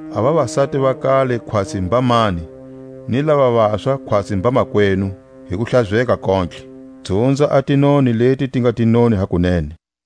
a vavasati va kale khwatsi mbamani, ni lava vaswa khwatsi mbamakwenu, hi kuhlazeka kontlhe. Dzunza a tinoni leti ti nga tinoni hakunene.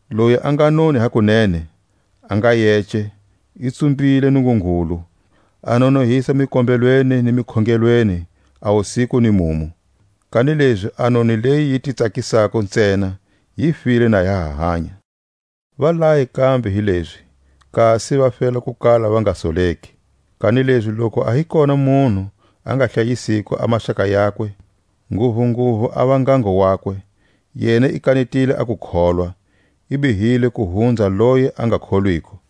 Loyi a nga noni hakunene, a nga yece, i tsumbile Nungungulu, a nonohisa mikombelweni ni mikhongelweni a wusiku ni mumu. Kanilezi a noni leyi yi ti tsakisako ntsena, yi file na ya ha hanya. Va laye kambe hi lezi, kasi va fela ku kala va nga soleki. Kanilezi loku a hi kona munhu a nga hlayisiko a maxaka yakwe, nguvunguvu a va ngango wakwe, yena i kanetile a kukholwa, i bihile ku hunza loyi a nga kholwiko.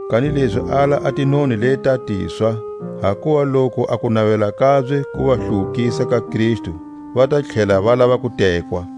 Kanilezi ala a tinoni leʼta tiswa; hakuva loku a kunavela kabye ku va hluwukisa ka Kristu, va ta tlhela va lava ku tekwa.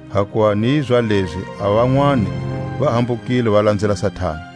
Hakuva ni zalezi a vanwani va hambukile va lanzela Satani.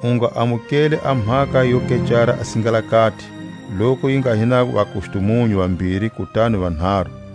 U nga amukeli a mhaka yo kecara a singalakati, loku yi nga hi na vakustumunyu vambiri kutani vanharu.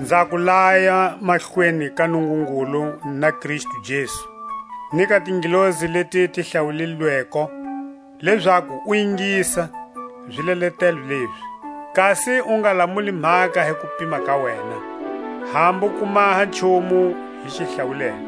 Nza ku laya mahlweni ka Nungungulu na Kristu Jesu, ni ka tingelosi leti ti hlawulilweko, lezaku u ingisa zileletelo lezi, kasi u nga lamuli mhaka hi kupima ka wena, hambu ku maha nchumu hi xihlawulela.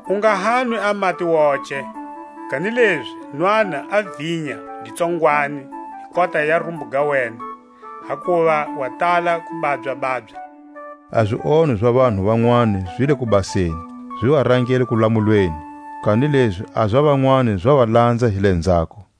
U nga hanwi a mati woce, kanilezi nwana a vinya gi tsongwani hi kota ya rumbu ga wena, hakuva wa tala ku babya-babya. A zionho za vanhu vanwani zi le kubaseni, zi va rangela kulamulweni; kanilezi a za vanwani za va lanza hi lenzhako.